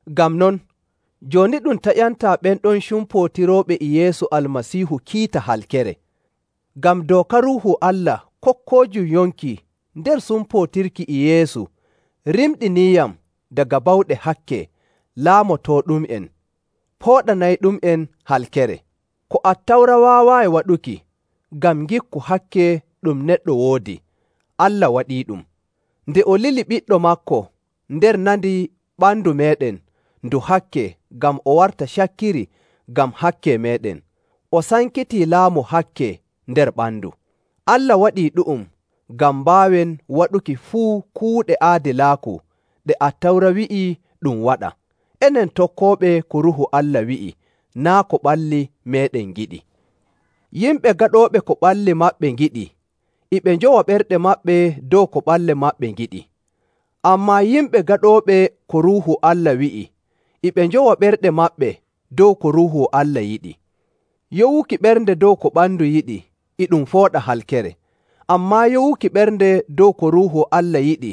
Ngam non, jooni ɗum taƴantaa ɓen ɗon cumpootirooɓe e Yeesu Almasiihu kiita halkere. Ngam dooka Ruuhu Allah kokkoojum yonki nder sumpootirki e Yeesu rimɗiniiyam daga bawɗe hakke laamotooɗum'en pooɗanayɗum'en halkere. Ko Attawra waawaayi waɗuki, ngam ngikku hakke ɗum neɗɗo woodi, Allah waɗiiɗum. Nde o lili ɓiɗɗo maako nder nandi ɓandu meeɗen ndu hakke ngam o warta cakkiri ngam hakke meeɗen, o sankitii laamu hakke nder ɓandu. Allah waɗii ɗu'um ngam mbaawen waɗuki fuu kuuɗe aadilaaku ɗe Attawra wi'i ɗum waɗa, enen tokkooɓe ko Ruuhu Allah wi'i, naa' ko ɓalli meeɗen ngiɗi. Yimɓe gaɗooɓe ko ɓalli maɓɓe ngiɗi, e ɓe njowa ɓerɗe maɓɓe dow ko ɓalli maɓɓe ngiɗi. Ammaa yimɓe gaɗooɓe ko Ruuhu Allah wi'i, e ɓe njowa ɓerɗe maɓɓe dow ko Ruuhu Allah yiɗi. Yowuki ɓernde dow ko ɓandu yiɗi e ɗum fooɗa halkere, ammaa yowuki ɓernde dow ko Ruuhu Allah yiɗi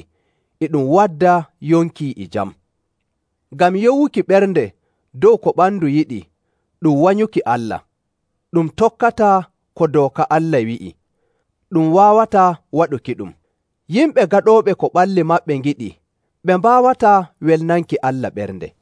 e ɗum wadda yonki e jam. Ngam yowuki ɓernde dow ko ɓandu yiɗi ɗum wanyuki Allah, ɗum tokkataa ko dooka Allah wi'i, ɗum waawataa waɗukiɗum. Yimɓe gaɗooɓe ko ɓalli maɓɓe ngiɗi ɓe mbaawataa welnanki Allah ɓernde.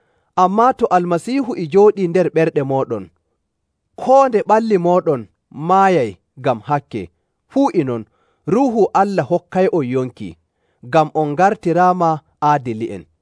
Ammaa to Almasiihu e jooɗii nder ɓerɗe mooɗon, koo nde ɓalli mooɗon maayay ngam hakke, fuu e non Ruuhu Allah hokkay'on yonki, ngam on ngartiraama aadili'en.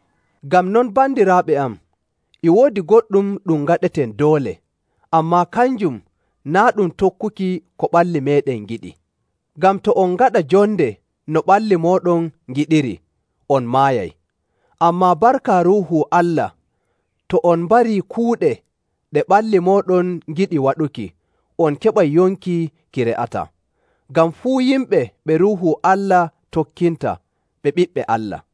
Ngam non bandiraaɓe am, e woodi goɗɗum ɗum ngaɗeten doole, ammaa kanjum naa' ɗum tokkuki ko ɓalli meeɗen ngiɗi. Ngam to on ngaɗa jonde no ɓalli mooɗon ngiɗiri, on maayay. Ammaa barka Ruuhu Allah, to on mbarii kuuɗe ɗe ɓalli mooɗon ngiɗi waɗuki, on keɓay yonki ki re'ataa. Ngam fuu yimɓe ɓe Ruuhu Allah tokkinta ɓe ɓiɓɓe Allah.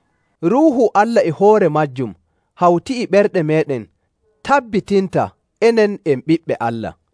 Ruuhu Allah e hoore maajum hawti e ɓerɗe meeɗen tabbitinta enen en ɓiɓɓe Allah.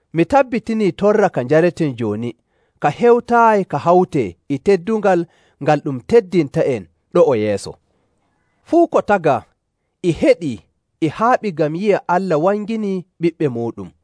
Mi tabbitinii torra ka njareten jooni ka hewtaayi ka hawtee e teddungal ngal ɗum teddinta'en ɗo'o yeeso. Fuu ko tagaa e heɗii e haaɓi ngam yi'a Allah wanginii ɓiɓɓe muuɗum.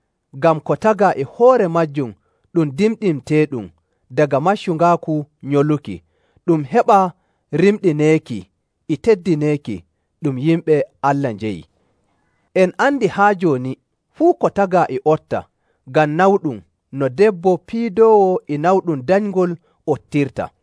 ngam ko tagaa e hoore maajum ɗum dimɗinteeɗum daga maccungaaku nyoluki, ɗum heɓa rimɗineeki e teddineeki ɗum yimɓe Allah njeyi. En andi haa jooni fuu ko tagaa e otta ngam nawɗum no debbo piidoowo e nawɗum danyngol ottirta.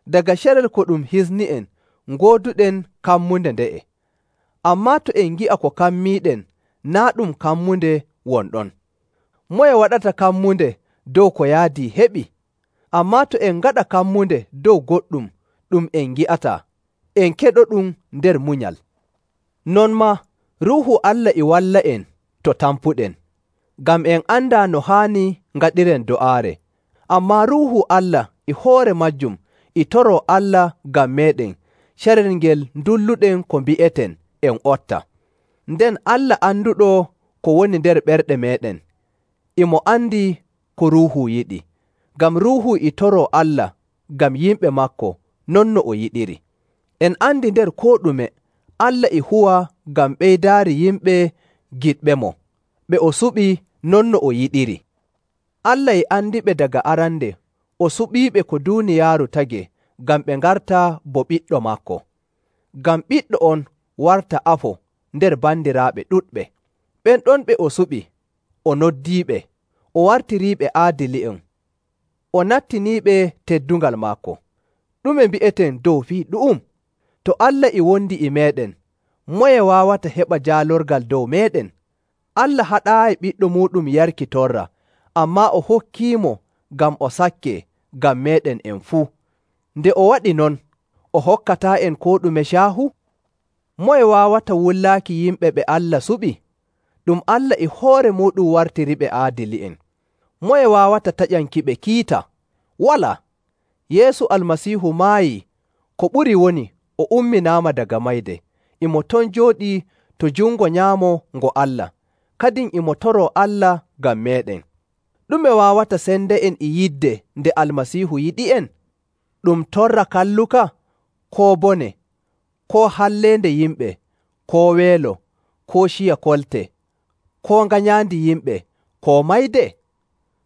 Daga carel ko ɗum hisni'en ngooduɗen kammunde nde'e. Ammaa to en ngi'a ko kammiiɗen, naa' ɗum kammunde won ɗon. Moye waɗata kammunde dow ko yaadi heɓi? Ammaa to en ngaɗa kammunde dow goɗɗum ɗum en ngi'ataa, en keɗoɗum nder munyal. Non maa, Ruuhu Allah e walla'en to tampuɗen. Ngam en andaa no haani ngaɗiren do'aare, ammaa Ruuhu Allah e hoore maajum e toroo Allah ngam meeɗen carel ngel ndulluɗen ko mbi'eten en otta. Nden Allah anduɗo ko woni nder ɓerɗe meeɗen, e mo andi ko Ruuhu yiɗi, ngam Ruuhu e toroo Allah ngam yimɓe maako non no o yiɗiri. En andi nder koo ɗume Allah e huwa ngam ɓeydaari yimɓe giɗɓemo, ɓe o suɓi non no o yiɗiri. Allah e andiɓe daga arande o suɓiiɓe ko duuniyaaru tagee ngam ɓe ngarta bo Ɓiɗɗo maako, ngam Ɓiɗɗo on warta afo nder bandiraaɓe ɗuɗɓe. Ɓen ɗon ɓe o suɓi, o noddiiɓe, o wartiriiɓe aadili'en, o nattiniiɓe teddungal maako. Ɗume mbi'eten dow fii ɗu'um? To Allah e wondi e meeɗen, moye waawata heɓa jaalorgal dow meeɗen? Allah haɗaayi Ɓiɗɗo muuɗum yarki torra, ammaa o hokkiimo ngam o sakkee ngam meeɗen en fuu. Nde o waɗii non, o hokkataa'en koo ɗume caahu? Moye waawata wullaaki yimɓe ɓe Allah suɓi? Ɗum Allah e hoore muuɗum wartiriɓe aadili'en. Moye waawata taƴankiɓe kiita? Walaa! Yeesu Almasiihu maayii, ko ɓuri woni o umminaama daga mayde, e mo ton jooɗii to jungo nyaamo ngo Allah, kadin e mo toroo Allah ngam meeɗen. Ɗume waawata senda'en e yidde nde Almasiihu yiɗi'en? Ɗum torra kalluka, koo bone, koo halleende yimɓe, koo weelo, koo ciya kolte, koo nganyaandi yimɓe, koo mayde?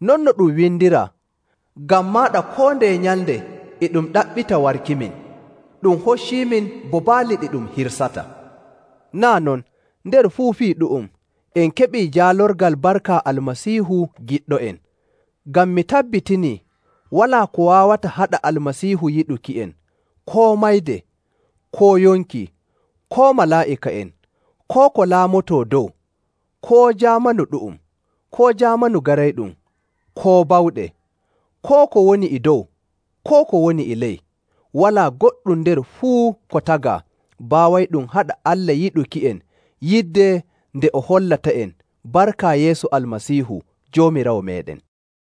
Non no ɗum windiraa, “Ngam maaɗa koo ndeye nyalnde e ɗum ɗaɓɓita warkimin; ɗum hocciimin bo baali ɗi ɗum hirsata.”. Naa' non, nder fuu fii ɗu'um en keɓii jaalorgal barka Almasiihu giɗɗo'en. Ngam mi tabbitinii walaa ko waawata haɗa Almasiihu yiɗuki'en, koo mayde, koo yonki, koo malaa'ika'en, koo ko laamotoo dow, koo jaamanu ɗu'um, koo jaamanu garayɗum, koo bawɗe, koo ko woni e dow, koo ko woni e ley, walaa goɗɗum nder fuu ko tagaa baawayɗum haɗa Allah yiɗuki'en yidde nde o hollata'en barka Yeesu Almasiihu Joomiraawo meeɗen.